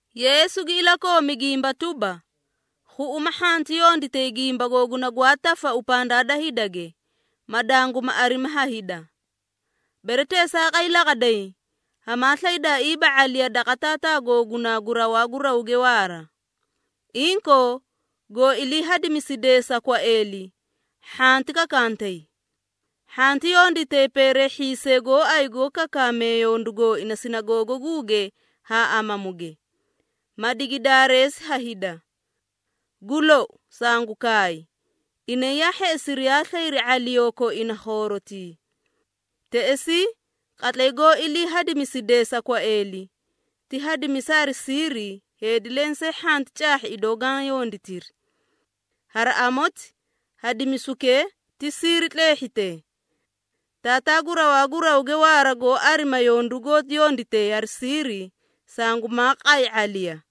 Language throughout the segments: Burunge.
Yeesu gi ilakoomi gimba tuba, “Khuꞌuma hhanti yonditay gimba googuna gwaa tafau pandaa da hidage, ma danguma arimi ha hida. Bere teesaaqay laqaday, hamaa slaydaaiiba ⁄aliya daqa Taataa googunaa gu rawaa gu rawge waara. Inkoo, goó ilii hadimisidee sa kwaeeli, hhanti kakantay. Hhanti yonditay peereehhiisee gooay goó kakaamee yondu gooina sinagoogaguuge haa amamuge, ma digi daareesi ha hida. Gu lou, sangu kaay, inay yaa hheꞌesiri yaa slayri ⁄aliyoo koina khoorotii. Teꞌesii, qatlay goó ilii hadimisidee sa kwaeeli, ti hadimisa hari siiri heedi lensee hhanti caahhi idoo gaã yonditiri. Hari amoti, hadimisukee ti siiri tleehhite. Taataa gu rawaa gu rawge waara goó arima yondu goó yonditee hari siiri, sangumaa qay ⁄aliya.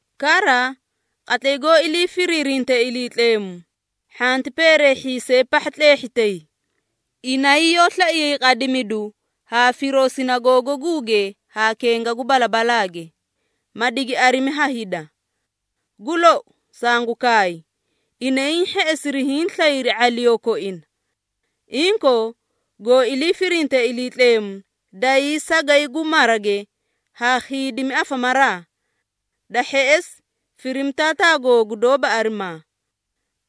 Kara, qatlay goó ilii firiirintee Iliitleemu, hhanti peereehhiisee pahha tleehhitay. Inay yoó slaiyay qadimidu haa firoo sinagoogaguuge haa kenga gu balabalaage, ma digi arimi ha hida. Gu lou, sangu kaay, inay hiĩ hheꞌesiri hiĩ slayri ⁄aliyoo koina. Inkoo, goó ilii firinte Iliitleemu, dayii sagay gu marage haa khiidimi afamaraa. Da hheꞌesi, firimi Taataa googu doóba arimaa.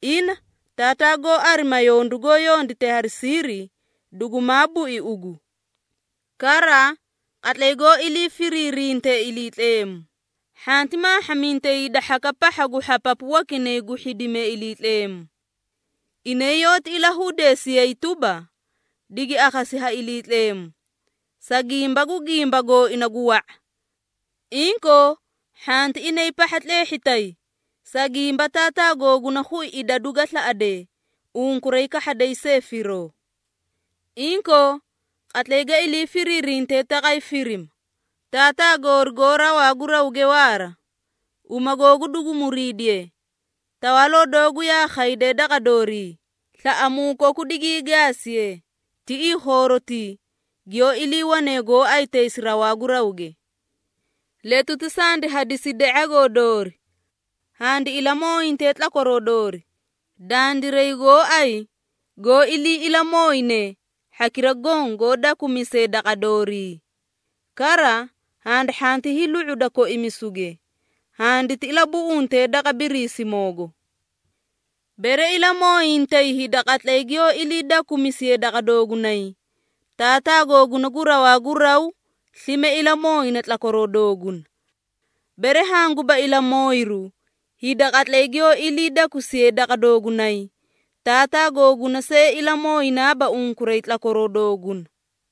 Ina, Taataa goó arima yondu goó yondite hari siiri, dugumaa bui ugu. Kara, qatlay goó ilii firiirinte Iliitleemu, hhanti maahhamintay hida hhakaꞌa pahha gu hhapapu wakinay gu hhidimee Iliitleemu. Inay yoóti ilahudeesiyay tuba, digi akhasi ha Iliitleemu, sa gimba gu gimba gooina gu wa⁄a. Inkoo, hhanti inay pahha tleehhitay, sa gimba Taataa googuna khui idadu ga slaꞌadee, unkuray kahhaday see firoo! Inkoo, qatlay ga ilii firiirintee taqay firima, ‘Taataa goori goó rawaa gu rawge waara, uma googu dugu muriidiye, tawaaloo doogu yaa khayde daqa doorii, slaꞌamuu koku digii gaasiye, tiꞌii khoorotii giyoó iliiwane gooay taysi rawaa gu rawge. Letuti sandi hadiside ⁄agoo doori. Handi ilamooyinte tlakwaroo doori, dandiray gooay goó ilii ilamooyine, hhakira goõ goó dakumisee daqa doorii. Kara, handi hhanti hiilu⁄uda koimisuge, handiti ilabuꞌunte daqa Biriisimoogo.’ Bere ilamooyintay hida qatlay giyoó ilii dakusiyee daqa doogunay, Taataa googuna gu rawaa gu raw slime ilamooyina tlakwaroo dooguna. Bere hanguba ilamooyiru hida qatlay giyoó ilii dakusiyee daqa doogunay, Taataa googuna see ilamooyinaaba unkuray tlakwaroo dooguna.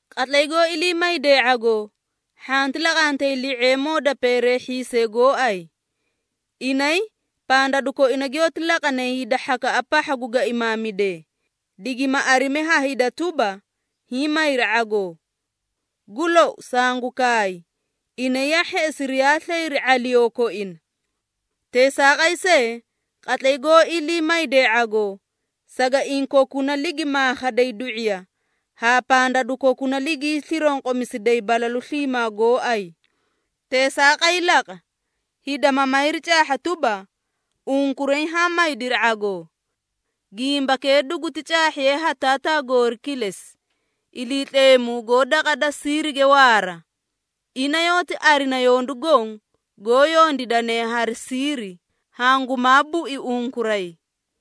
Qatlay goó ilii maydee ⁄agoo, hhanti laqantay li⁄eemoo da peereehhiisee gooay. Inay pandadu koina giyoóti laqanay hida hhakaꞌa pahha gu gaimaamidee, digima arimi ha hida tuba, hiĩ mayri ⁄agoo. Gu lou, sangu kaay, inay yaa hheꞌesiri yaa slayri ⁄aliyoo koina. Teesaaqay see, qatlay goó ilii maydee ⁄agoo, sagaiĩ kokuna ligi maakhaday du⁄iya haa pandadu kokuna ligii slironqomisiday balalu sliimaa gooay. Teesaaqay laqa, hida ma mayri caahha tuba, unkuray haã maydiri ⁄agoo. Gimbakee duguti caahhiye ha Taataa goori kilesi, Iliitleemu goó daqa da siirige waara. Ina yoóti arina yondu goõ goó yondiidane hari siiri, hangumaa bui unkuray.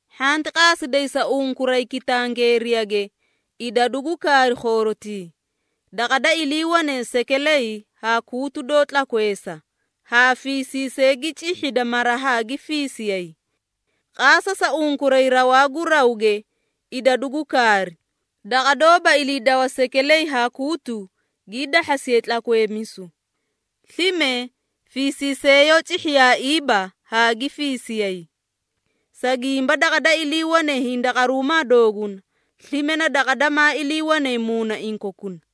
Hhanti qaasiday sa unkuray kitangeeriyage idadu gu kaari khoorotii daqa da iliiwane sekeley haa kuutu doó tlakweesa, haa fiisiisee gi cihhida mara haa gi fiisiyay. Qaasa sa unkuray rawaa gu rawge idadu gu kaari, daqa doóba iliidawa sekeley haa kuutu gii dahhasiyay tlakweemisu, slime fiisiisee yoó cihhiyaaiiba haa gi fiisiyay. Sa gimba daqa da iliiwane hindaqaruumaa dooguna, slime na daqa damaa iliiwane muunaiĩ kokuna.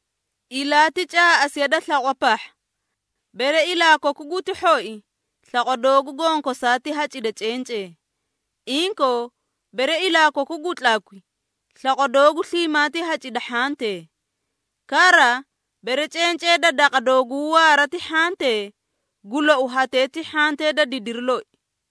Ilaa ti caaꞌasiya da slaqwa pahha. Bere ilaa koku guti hhoi, slaqwa doogu gonkosaa ti hacida cencee. Inkoo, bere ilaa koku gu tlakwi, slaqwa doogu sliimaa ti hacida hhantee. Kara, bere cencee da daqa dooguu waara ti hhantee, gu lou hatee ti hhantee da didiri loi!”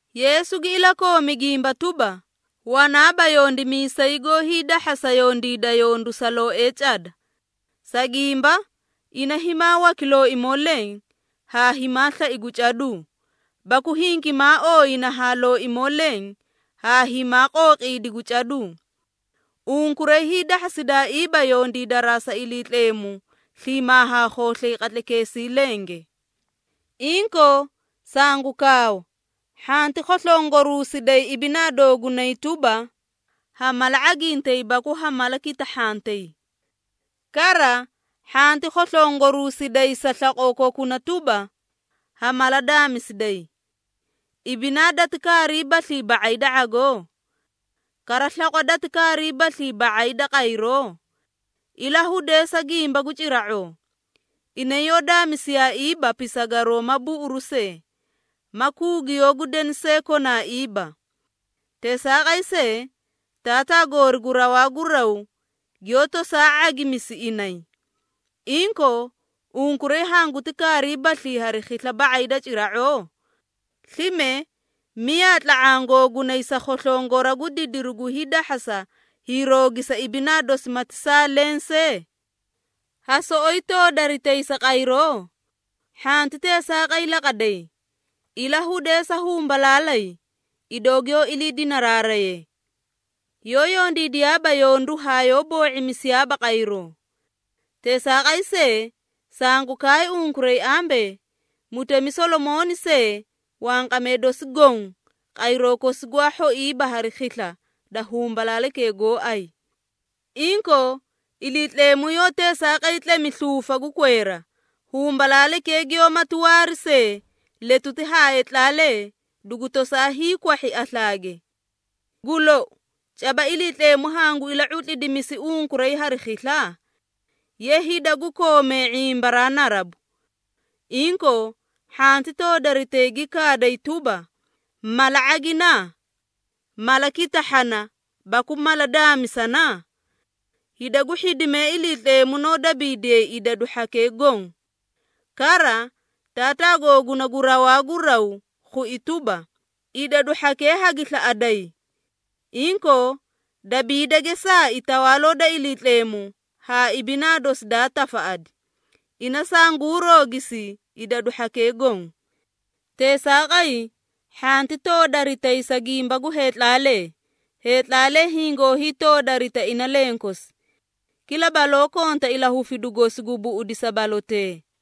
Yeesu gi ilakoomi gimba tuba, “Wanaaba yondimiisay goó hiidahhasa yondiida yondu sa looee cada. Sa gimba, ina himaa waki looimoo leẽ haa himaa slai gu caduu, baku hingimaa ooyina haa looimoo leẽ haa himaa qooqiidi gu caduu. Unkuray hiidahhasidaaiiba yondiidaraa sa Iliitleemu sliimaa haa khooslay qatlaykeesii lenge. Inkoo, sangu kaawa hhanti khoslongoruusiday sa ibinaa doogunay tuba, ha mala ⁄agintay baku ha mala kitahhantay. Kara hhanti khoslongoruusiday sa slaqoo kokuna tuba, ha mala daamisiday. Ibinaa dati kaariibaslii ba⁄ay da ⁄agoo? Kara slaqwa dati kaariibaslii ba⁄ay da qayroo? Ilahudeesa gimba gu cira⁄oo. Inay yoó daamisiyaaiiba pisagaroo ma buꞌuruu see, ma kuugiyoo gu deni see konaaiiba. Teesaaqay see, Taataa goori gu rawaa gu raw giyoó tosaa ⁄agimisi inay. Inkoo, unkuray hanguti kaariibaslii hari khisla ba⁄ay da cira⁄oo? Slime miyaa tla⁄aã googunay sa khoslongora gu didiri gu hiidahhasa hiiroogisa ibinaa dosi mati saa leẽ see? Ha soꞌoyi toodaritay sa qayroo? Hhanti teesaaqay laqaday! Ilahudeesa humbalaalay, idoo giyoó ilii dinaraaraye. Yoó yondiidiyaaba yondu haa yoó boo⁄imisiyaaba qayroo. Teesaaqay see, sangu kaay unkuray ambee, mutemi Solomooni see wanqamee dosi goõ, qayroo kosi gwaa hhoiiba hari khisla da humbalaalaykee gooay! Inkoo, Iliitleemu yoó teesaaqay tlemi sluufa gu kweera, humbalaalaykee giyoómati waari see letuti haa heetlaalee dugu tosaa hiikwahhi aslaage. Gu lou, caba Iliitleemu hangu ila⁄utlidimisi unkuray hari khisla? Ye hida gu koomee ⁄imbaraa narabu! Inkoo, hhanti toodaritay gi kaaday tuba, ‘Mala ⁄agina?’ ‘Mala kitahhana baku mala daamisana?’ Hida gu hhidimee Iliitleemu noó dabiidiyay idadu hhakee goõ. Kara, Taataa googuna gu rawaa gu raw khui tuba, idadu hhakee hagi slaꞌaday! Inkoo, dabiida geesaai Tawaaloo da Iliitleemu haa ibinaa dosi daa tafaꞌadi, ina sanguu roogisi idadu hhakee goõ. Teesaaqay, hhanti toodaritay sa gimba gu heetlaalee, heetlaalee hingoo hiitoodarita ina lenkosi. Kila baloo konta ilahufidu gosi gu buꞌudisa balotee.”